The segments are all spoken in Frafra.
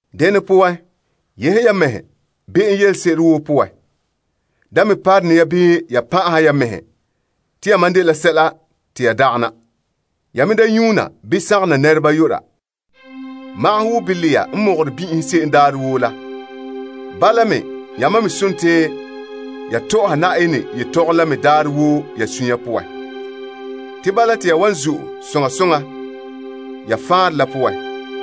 Dene poan, yehe ya mɛhe be'em yelese'ere woo poan. Da me parone ya bii ya pan'ahɛ ya mɛhe te yamam dela sɛla te ya dagana. Ya me da nyuuna bii sagona nɛreba yu'ura. Magahɛ wo bilɛɛhe n mɔgɔrɛ bin'ihom se'em daarɛ woo la, bala me, yamam me sontii ya tɔ'ɔha Na'ayenɛ yetɔgom la me daarɛ woo ya suunre poan. Te bala te ya wan zo'e soŋa soŋa ya faanrɛ la poan.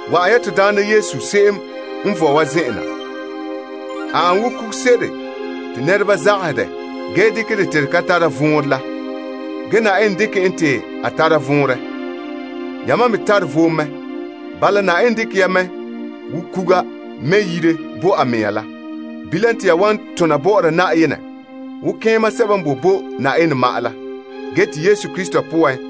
Wa'an ya to Daana Yesu se'em n vɔe wa zen'en na. A ane wo kuguse'ere te nɛreba zagahɛ dɛ ge dekɛ dɛ te de ka tare vɔnrɛ la. Ge Na'ayenɛ dekɛ en te a tara vɔnrɛ. Yamam me tare vom mɛ. Bala, Na'ayenɛ dekɛ ya mɛ wo kuga mɛ' yire bo a mea la. Bilam te ya wan tona bɔ'ɔra Na'ayenɛ wo toolom malema daandoma n tare kaanbegɔ bo'olom sebo n tegere Na'ayenɛ nini doohe Yesu Krista poan.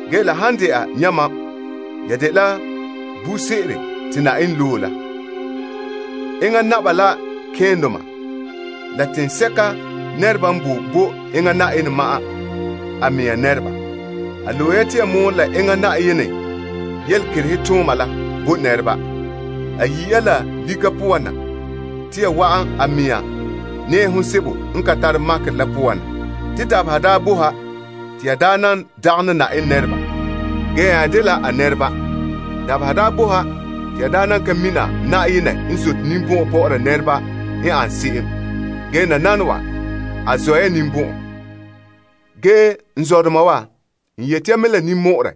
Ge la han dɛna yamam, ya dela buuri se'ere te Na'ayenɛ loe, ya dela Naba la malemadoma, ya dela toolom teŋa, ya dela Na'ayenɛ mɛŋa nɛreba. A loe ya te ya mɔɔlɛ la enŋa Na'ayenɛ yelekerehe tooma la bo nɛreba. A yi' ya la lika poan te ya wa'an a mɛŋa nɛɛhom sebo n ka tare makerɛ la poan na. Te dabeha daa boe ha te ya daa nan dagana Na'ayenɛ nɛreba, ge ya nya dela a nɛreba. Dabeha daa boe ha te ya daa nan ka mina Na'ayenɛ n zote ninbɔn'ɔn bɔ'ɔra nɛreba n ane se'em, ge nananawa, a zɔ' ya ninbɔn'ɔn. N zɔdoma wa, n yeti ya mɛ la ninmɔ'ɔrɛ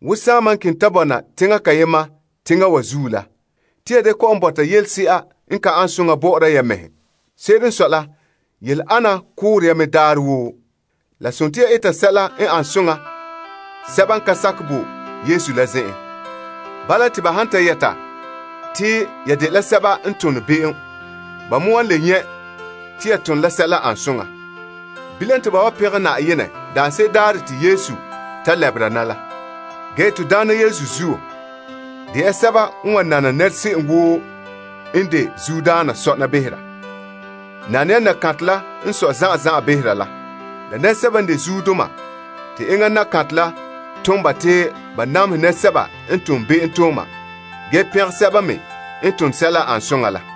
wo saama n keŋɛ ta bɔna teŋa kayema teŋa wa zuo la, yehe ya ya mɛhe koŋkoma'ahom yooro poan. Se'ere n sɔe la, yele ana koore ya mɛ daarɛ woo. La sontii ya eta sɛla n ane soŋa sɛba n ka sakɛ bo Yesu la zen'en. Bala, te ba han ta yɛta te ya dela sɛba n tone be'em, ba me wan le nyɛ' te ya tone la sɛla ane soŋa. Bilam, te ba wan pɛngɛ Na'ayenɛ daanse'ere daarɛ te Yesu ta lɛbera na la. To Daana Yesu zuo, de ya sɛba n wan nana nɛra se'em woo n de zuodaana sɔna behera. Nane ya nakantɛ la n sɔe zan'an zan'an behera la, bii teŋbeheradoma te enŋa nakantɛ la tom ba te ba namehɛ nɛresɛba n tom be'emtooma ge pɛngɛ sɛba me n tone sɛla n ane soŋa la.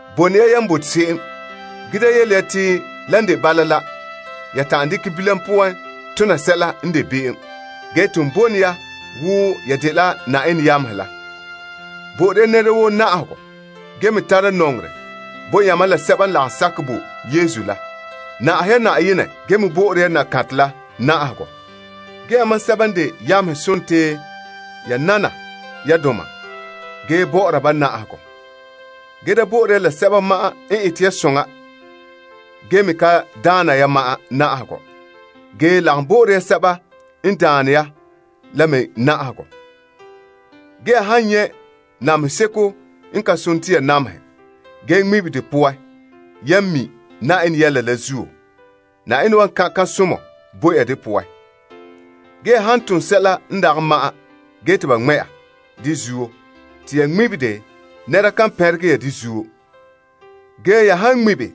Boe ne ya yan fai. Da yele ya te lan de bala la, ya ta'an dekɛ bilam poan tona sɛla n de be'em, ge ton bone ya wo ya dela Na'ayenɛ yamehe la. Bo'ore ya nɛra woo na'ahegɔ ge me tara nɔŋerɛ bo yamam la sɛba n lagom sakɛ bo Yesu la. Na'ahe ya Na'ayenɛ ge me bo'ore ya nakantɛ la na'ahegɔ. Yamam sɛba n de yamehe sontii ya nana ya doma ge bɔ'ɔra ba na'ahegɔ. Da bo'ore ya la sɛba ma'an n ete ya soŋa ge me ka daana ya ma'an na'ahegɔ, ge lagom bo'ore ya sɛba n daane ya la me na'ahegɔ. Ya han nyɛ' namehe seko n ka sone te ya namehɛ, ge ŋmibe de poan yan mi' Na'ayenɛ yɛla la zuo, Na'ayenɛ wan kan' kan'somɔ bo ya de poan. Ya han tom sɛla n dagɛ ma'an ge te ba ŋmɛ' ya de zuo te ya ŋmibe de, nɛra kan pɛngɛ ya de zuo. Ge ya han ŋmibe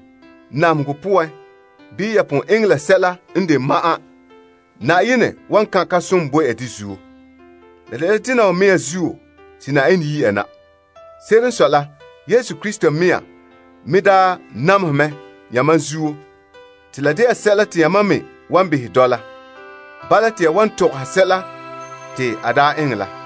namehegɔ poan la yan tom la sɛla n de ma'an la zuo, Na'ayenɛ wan kan' kan'somɔ bo ya de zuo. La dela dena wa mea zuo te Na'ayenɛ yi' ya na. Se'ere n sɔe la, Yesu Krista mea me daa namehɛ mɛ yamam zuo te la de'a sɛla te yamam me wan behɛ dɔla. Bala te ya wan tɔgɔha sɛla te a daa eŋɛ la.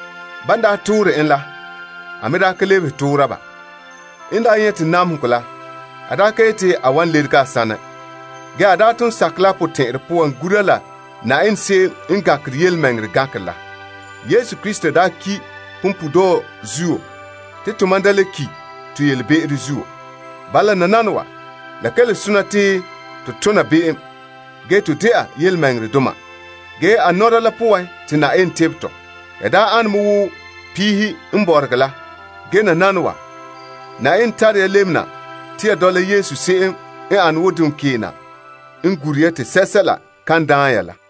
Ban daa toore en la, a me daa ka lebehe toora ba. N daa nyɛte namehegɔ la, a daa ka yeti a wan lerege a saanɛ. Ge a daa ton sakɛ la a potɛn'ɛrɛ poan gura la Na'ayenɛ n de tontɔɔ gankera la. Yesu Krista daa ki' punpuuredɔɔ zuo te tomam da le ki' to be'em poan. Bala nananawa, la ka le sona te to tona be'em, ge to dɛna yelemɛŋɛrɛdoma. A fuula la poan te Na'ayenɛ tebɛ tɔ. Ya daa ane me wo piihe n bɔregɛ la. Ge nananawa, Na'ayenɛ tare ya lebena te ya dɔla Yesu se'em n ane wo duŋkeena n gure ya te sɛla kan daan ya la.